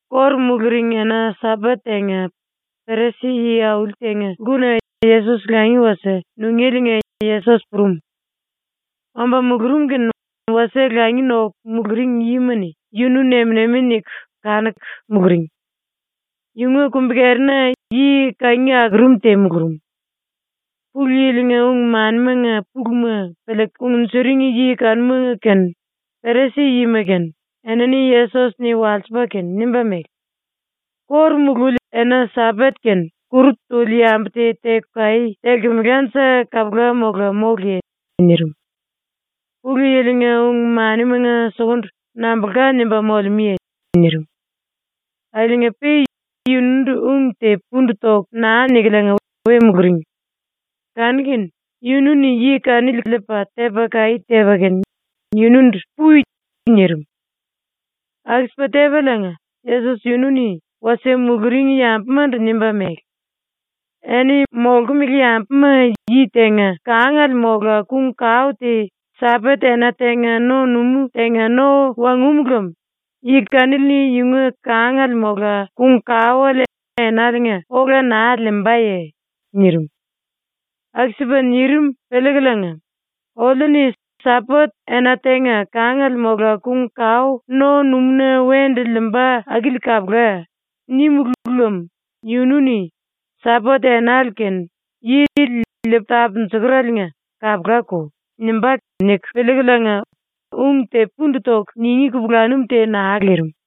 ⸤Kóru muluring⸥ ena-Sambat tenga Perisi-yi auli tenga lkuna Yesos langi wasie nungéliinga Yesos purum. Omba mulurum kene wasie langi noku muluring yima-ni yunu nem-nemi niku kanuku muluring. Yunga kumbi-kerina yi kangi akurum te mulurum. Pulu Yili-nga ung-manimanga puluma piliiku kungnjuring yi kanuma kene, Perisi-yima kene, enini Yesos-ni walsipa kene nimba mele: “⸤Kóru mululi⸥ ena-Sambat kene kuru tuli yambu te teku kaí telkemelanje kapula mola móluye?” nirim. “Pulu Yili-nga ung-manimanga sukundu nambulka nimba molemúye?” nirim. Akiliinga-pe yunundu ung te pundu toku naa nikuliinga we muluring. Kanu-kene yunu-ni yi kanili liipa tepa kaí tepa kene yunundu “Pui.” nirim. Aku-sipa tepaliinga Yesos yunu-ni wasie muluring yambumandu nimba mele: “Eni molkumele yambumanga yi tenga kangale mola kung-kao te Sambat-ena tenga no-numú tenga no wangúmu lem yi kanili-ni yunga kangale mola kung-kaoele enaliinga ola naa liimbaye?” nirim. Aku-sipa nirim piliikuliinga ⸤‘Oliu-ni “Sambat-ena tenga kangale mola kung-kao no-numúna wendu liimba akili kapula.” nímulu lem yunu-ni “Sambat-enale kene yili liipu tapunjukurele kapulako.” nimba.’ niku piliikuliinga⸥ ung te pundu toku ningí kupulanum te naa lirim.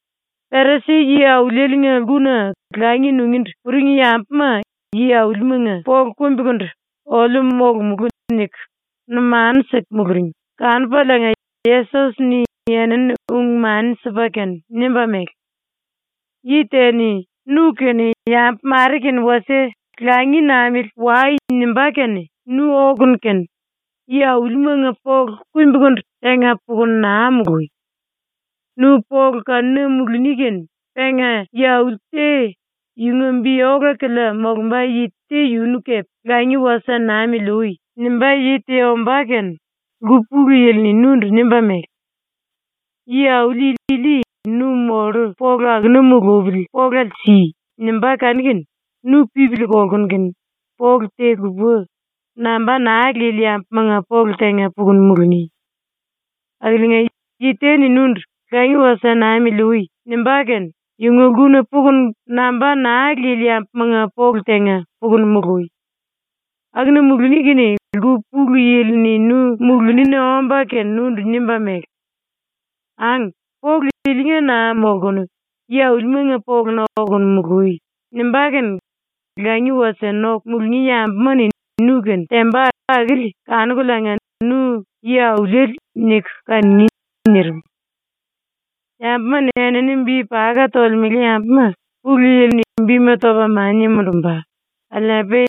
Perisi-yi aulieliinga lkuna langi nungíndu puring yambuma yi-aulimanga polu kumbikundu ‘oliu molomulú.’ niku numanu siku muluring kanupaliinga Yesos-ni enini ung-mani sipa kene nimba mele: “Yi te-ni nu kene yambu mare kene wasie “Langi namili wai.” nimbá kene nu okunu kene yi-aulimanga polu kumbikundu tenga pukunu naa molui. Nu polu kanuna muluni kene penga yi-auli te yunga bi ola-kilia molumba yi te yunu kepe ‘Langi wasie namili ui.’ nimbá yi te ombá kene lku pulu yili-ni nundu nimba mele: “Yi-auli ili nu mollu polu akuna mulupili polale si.” nimbá kanu-kene nu pipili kolkunu kene polu te lupa, namba naa lili yambumanga polu tenga pukunu muluni. “Akiliinga, yi te-ni nundu “Langi wasie namili ui.” nimbá kene yunga lkuna pukunu namba naa lili yambumanga polu tenga pukunu molui. Akuna muluni kene lku pulu yili-ni nu mulunina omba kene nundu nimba mele: “Ang, polu ilinga naa molkunu yi-aulimanga poluna okunu mului.” nimbá kene langi wasie noku mulungí yambuma-ni nu-kene temba akili kanukuliinga nu ‘Yi-auliele.’ niku kanungí.” nirim. “Yambuma-ni enini bi paka tolemele yambuma ⸤Pulu Yili-ni⸥ bima topa mania mundumba, akiliinga-pe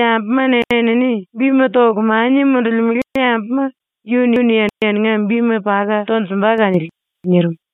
yambu enini bima toku mania mundulimele yambuma yunu-ni eninga bima paka tonjumba kanili.” nirim.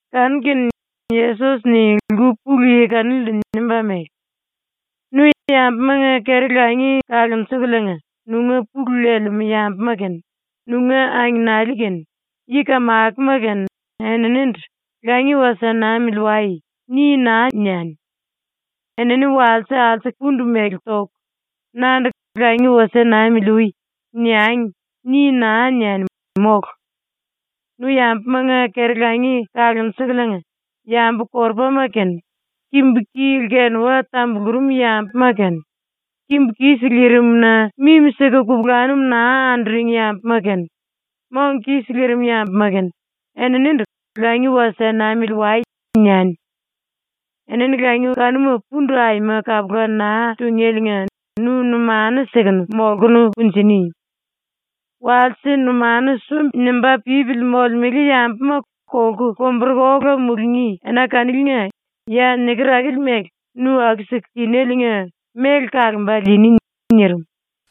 Kanu-kene Yesos-ni lku pulu yi kanilindu nimba mele: “Nu yambumanga keri-langi kalunjukuliinga nunga pulu lelemú yambuma kene, nunga angenali kene, yi-kamakoma kene eninindu ‘Langi wasie namili wai.’ ni naa niani. ‘Enini walse alsuku pundu mele toku, nandu ‘Langi wasie namili ui.’ niangi.’ ni naa niani, mólu! Nu yambumanga keri-langi kalunjukuliinga yambu-korupama kene, kimbu-ki lkenuwa tambulurum yambuma kene, kimbu kis lirim-na mimi-siku kupulanum naa anduring yambuma kene, mong kis lirim yambuma kene eninindu ‘Langi wasie namili wai.’ niani. Enini langi kanuma pundu aima kapula naa tungéliinga nu numanu sikunu molkunu kunjini. Walse numanu sumbi-nimba pípili molemele yambuma kolku lomburuku ola mulungí ena kaniliinga ya niker akili mele nu aku-siku tinéliinga méle kalomba liini.” nirim.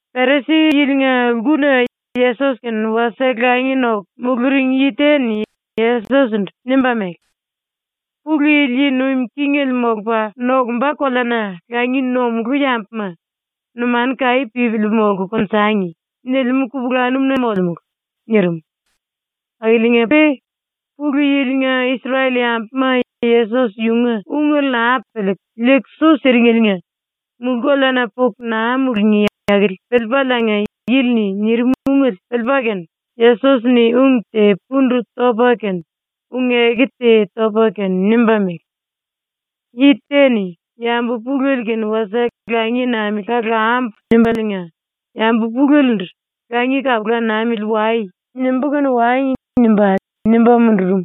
Perisi-yilinga lkuna Yesos-kene wasie langi noku muluring yi te-ni Yesos-ndu nimba mele: “Pulu Yili yi nuim kingele molupa nokumba koleana langi nomulú yambuma “Numanu kaí pípili molku konjangi.” nilimú kupulanum-na molemulu.” nirim. Akiliinga-pe Pulu Yili-nga Isrel-yambuma Yesos yunga ungele naa piliiku liiku su siringeliinga mulú-koleana puku naa mulungí akili piliipaliinga yili-ni nirim ungele piliipa kene Yesos-ni ung te pundu topa kene ung-eku te topa kene nimba mele: “Yi te-ni ‘Yambu pulele kene wasie langi namili kalambu.’ nimbaliinga yambu pulelendu “‘Langi kalupu namili wai.’ nimbú kene wangi.” nimba, nimba mundurum.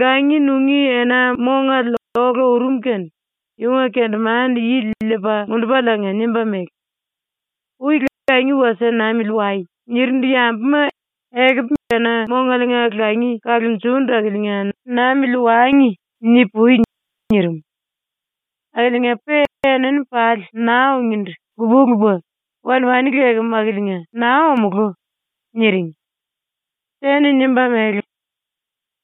Langi nungí ena-mongale ola urum kene yunga kendemande-yili liipa mundupaliinga nimba mele: “Ui “Langi wasie namili wai.” nirindu yambuma “Ekupu ena-mongaliinga langi kalunjundu akiliinga namili wangi.” ni-pui.” nirim. Akiliinga-pe enini pali naa ungíndu lupa-lupa “Wan-wani lekem akiliinga naa omulú.” niring. Te-ni nimba mele: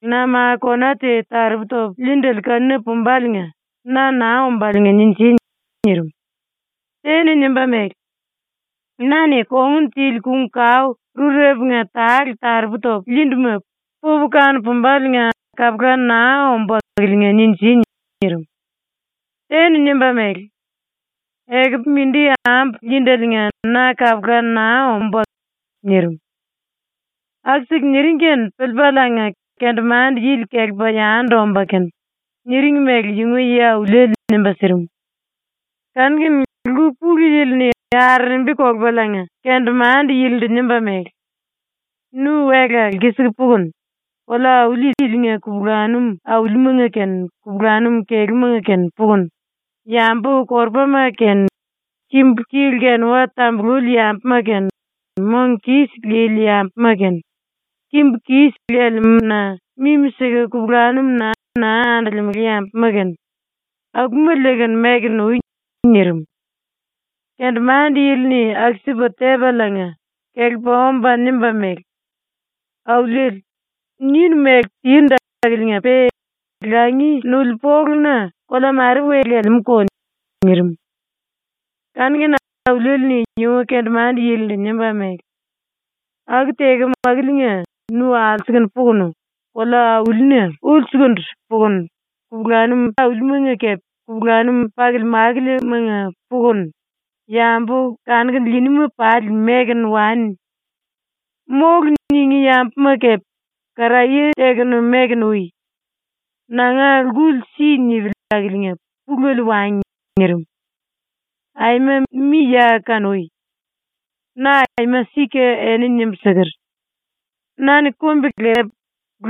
“Na ma kona te taropu topu liindele kanu-pumbaliinga na naa ombáliinga ninji.” nirim. Te-ni nimba mele: “Na-ni kongun tili kung-kao rurepunga tale taropu topu liinduma pupu kanu-pumbaliinga kapula naa ombú akiliinga ninji.” nirim. Te-ni nimba mele: “Ekupu mindi ambu liindeliinga na kapula naa ombú.” nirim. ⸤Aku-siku niring kene piliipaliinga⸥ kendemande-yili kelepa yandu omba kene niring mele yunga yi-auliele nimba sirim. Kanu-kene lku pulu yili-ni arerembi kolupaliinga kendemande-yilindu nimba mele: “Nu wela lkisiku pukunu, kolea-auli ilinga kupulanum aulimanga kene kupulanum kelúmanga kene pukunu, yambu-korupama kene kimbu-ki lkenuwa tambululi yambuma kene, mong kis lili yambuma kene kimbu kis lelemú-na mimi-siku kupulanum naa andolemele yambuma kene, akuma liikunu mekunu ui.” nirim. Kendemande-yili-ni aku-sipa tepaliinga kelepa omba nimba mele: “Auliele, ninu mele tindu akiliinga-pe langi nuli poluna kolea mare we lelemúko.” nirim. Kanu-kene auliele-ni yunga kendemande-yilindu nimba mele: “Aku tekem akiliinga nu alsukunu pukunu, kolea-aulina ulsukundu pukunu kupulanum aulimanga kepe kupulanum pakili-makilimanga pukunu, yambu kanuku liiníma pali mekunu wani. “Mólu.” ningí yambuma kepe karaye tekunu mekunu ui. Nanga lkuli si nipili akiliinga pulele wangi.” ⸤nirim.⸥ “Aima mi ya kanui. Na aima sika eni nimbu siker: “Na-ni kumbi-lepu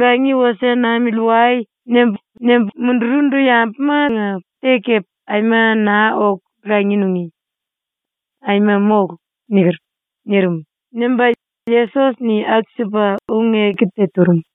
“Langi wasie namili wai.” nimbu, nimbu mundurundu yambumanga te kepe aima naa oku langi nungí. Aima mólu.” niker.” nirim.” nimba ⸤Yesos-ni aku-sipa ung-eku te turum.⸥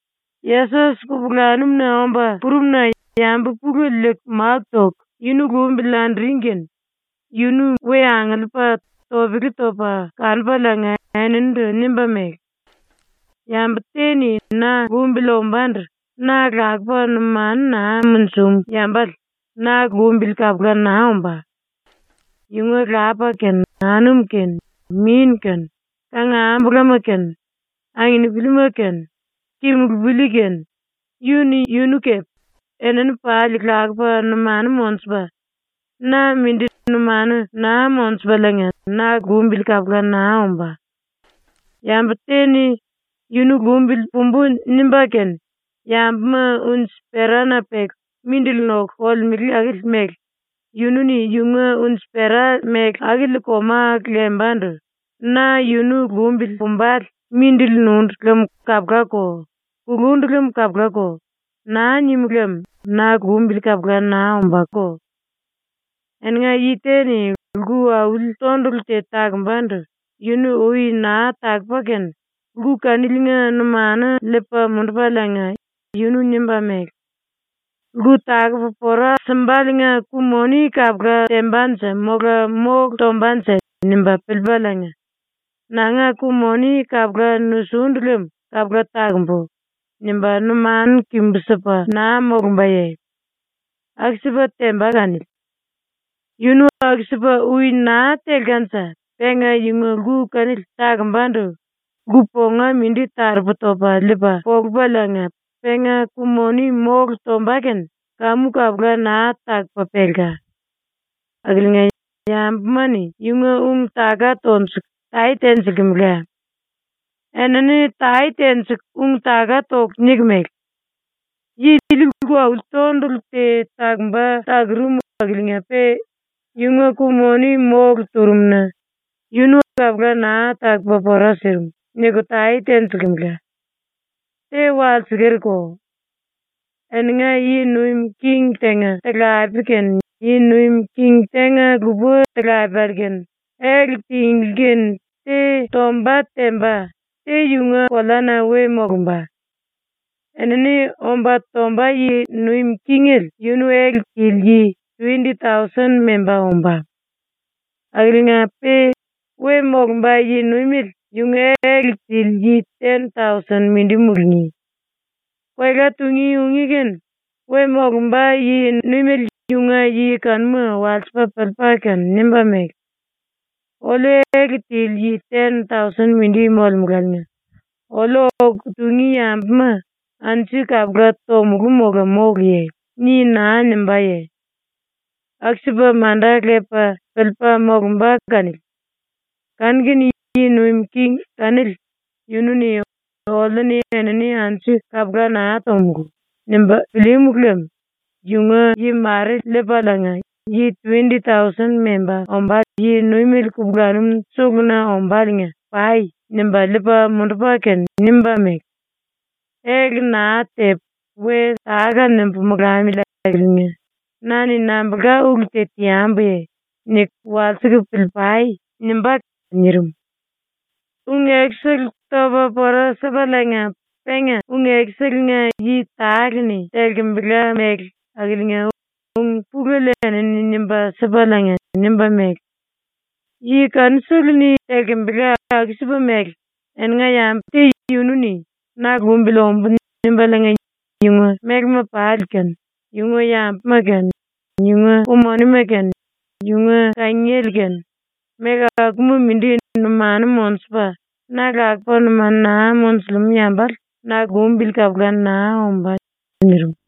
Yesos kupulanum-na omba purumna yambu pulele liiku máku toku yunu lumbili anduring kene yunu we angiliipa topele topa kanupaliinga eninindu nimba mele: “Yambu te-ni na lumbili ombándu na lakupa numanu naa munjum yambale na lumbili kapula naa ombá. Yunga lapa kene, anum kene, min kene, kangambulama kene, anginipilima kene, kimulupili kene, yu-ni yunu kepe, enini pali lakupa numanu monjupa, na mindi numanu naa monjupaliinga na lumbili kapula naa ombá. Yambu te-ni ‘Yunu lumbili pumbú.’ nimba kene yambuma unji-perana peku mindili noku kolemele akili mele yunu-ni yunga unji-pera mele akili koma lemba⸤ndu ‘Na yunu lumbili pumbale mindili nundu lem kapulako; kulundu lem kapulako.’ naa nim lem⸥ na lumbili kapula naa ombáko. “Eninga yi te-ni lku auli tondulu te takombandu yunu ui naa takupa kene lku kaniliinga numanu liipa mundupaliinga yunu nimba mele: ‘Lku takupu pora simbaliinga ku-moni kapula tembanje mola mólu tombanje?’ nimba piliipaliinga ‘Nanga ku-moni kapula nusundu lem kapula takumbu.’ nimba numanu kimbu-sipa naa molumbaye? ⸤Aku-sipa temba kanili.⸥ Yunu aku-sipa ui naa telkanje penga yunga lku kanili takombandu lku ponga mindi taropu topa liipa polupaliinga penga ku-moni mólu tomba kene kamu kapula naa takupa pelka. Akiliinga yambuma-ni yunga ung-taka tonjuku tae tenjilkemela. Enini tae tenjiku ung-taka toku niku mele: “Yi ili lku auli tondulu te takumba takurum akiliinga-pe yunga ku-moni mólu turum-na yunu kapula naa takupa pora sirim.” niku tae tenjilkemela. “⸤Te walsekerko.⸥ Eninga yi nuim king tenga talapele kene yi nuim king tenga-lupa talapele kene ele tinglí kene te tomba temba, te yunga koleana we molumba. Enini omba tomba yi nuim kingele yunu ele tili yi tuwendi-tausen memba ombá. Akiliinga-pe we molumba yi-nuimele yunga ele tili yi ten-tausen mindi mulungí. Koela tungí ungí kene we molumba yi-nuimele yunga yi kanuma walsipa piliipa kene nimba mele: “Oliu ele tili yi ten-tausen mindi molemuláliinga oliu oku tungí yambuma anju kapula tomulú mola móluye?” ni naa nimbáye? ⸤Aku-sipa manda lepa piliipa molumba kanili.⸥ Kanu-kene yi nuim king kanili yunu-ni ‘Oliu-ni enini anju kapula naa tomulú.’ nimba pilíímu lem yunga yi mare liipaliinga, yi tuwendi-tausen memba ombá yi-nuimele kupulanum suluna ombáliinga “Pai.” nimba liipa mundupa kene nimba mele: “‘Ele naa tepu we táka-nimbu molamili akiliinga na-ni nambulka ulu te teambuye?’ niku walsiku pilii-pai.” nimbá.” ⸤nirim.⸥ ⸤Ung-ekusele topa pora sipaliinga penga ung-ekuselenga yi tale-ni telkembela mele akiliinga ung-pulele enini nimba sipaliinga nimba mele:⸥ “⸤Yi kanusele-ni telkembela⸥ aku-sipa mele eninga yambu te yunu-ni ‘Na lumbili ombu.’ nimbaliinga yunga mélema pali kene, yunga yambuma kene, yunga ku-monima kene, yunga kangiele kene, méle akuma mindi numanu monjupa na lakupa numanu naa monjulemú yambale na lumbili kapula naa ombá.” ⸤nirim.⸥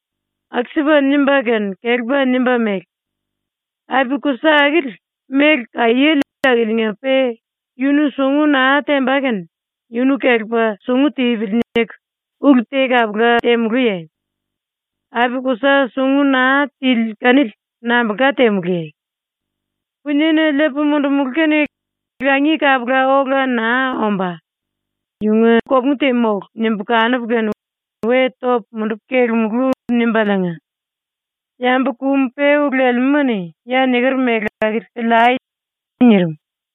⸤Aku-sipa nimba kene kelepa nimba mele:⸥ “Api-kusa akili méle kaiéle akiliinga-pe yunu sungu naa temba kene ‘Yunu kelepa sungu tipili.’ niku ulu te kapula temulúye? Api-kusa sungu naa tili kanili nambulka temulúye? ‘Puniena liipu mundumulú kene langi kapula ola naa ombá; yunga kopungu te mólu.’ nimbu kanupu kene we topu mundupu kelemulú.” ⸤nimbaliinga⸥ “Yambu kum-peú lelemúma-ni ya niker mele akili piliai.” nirim.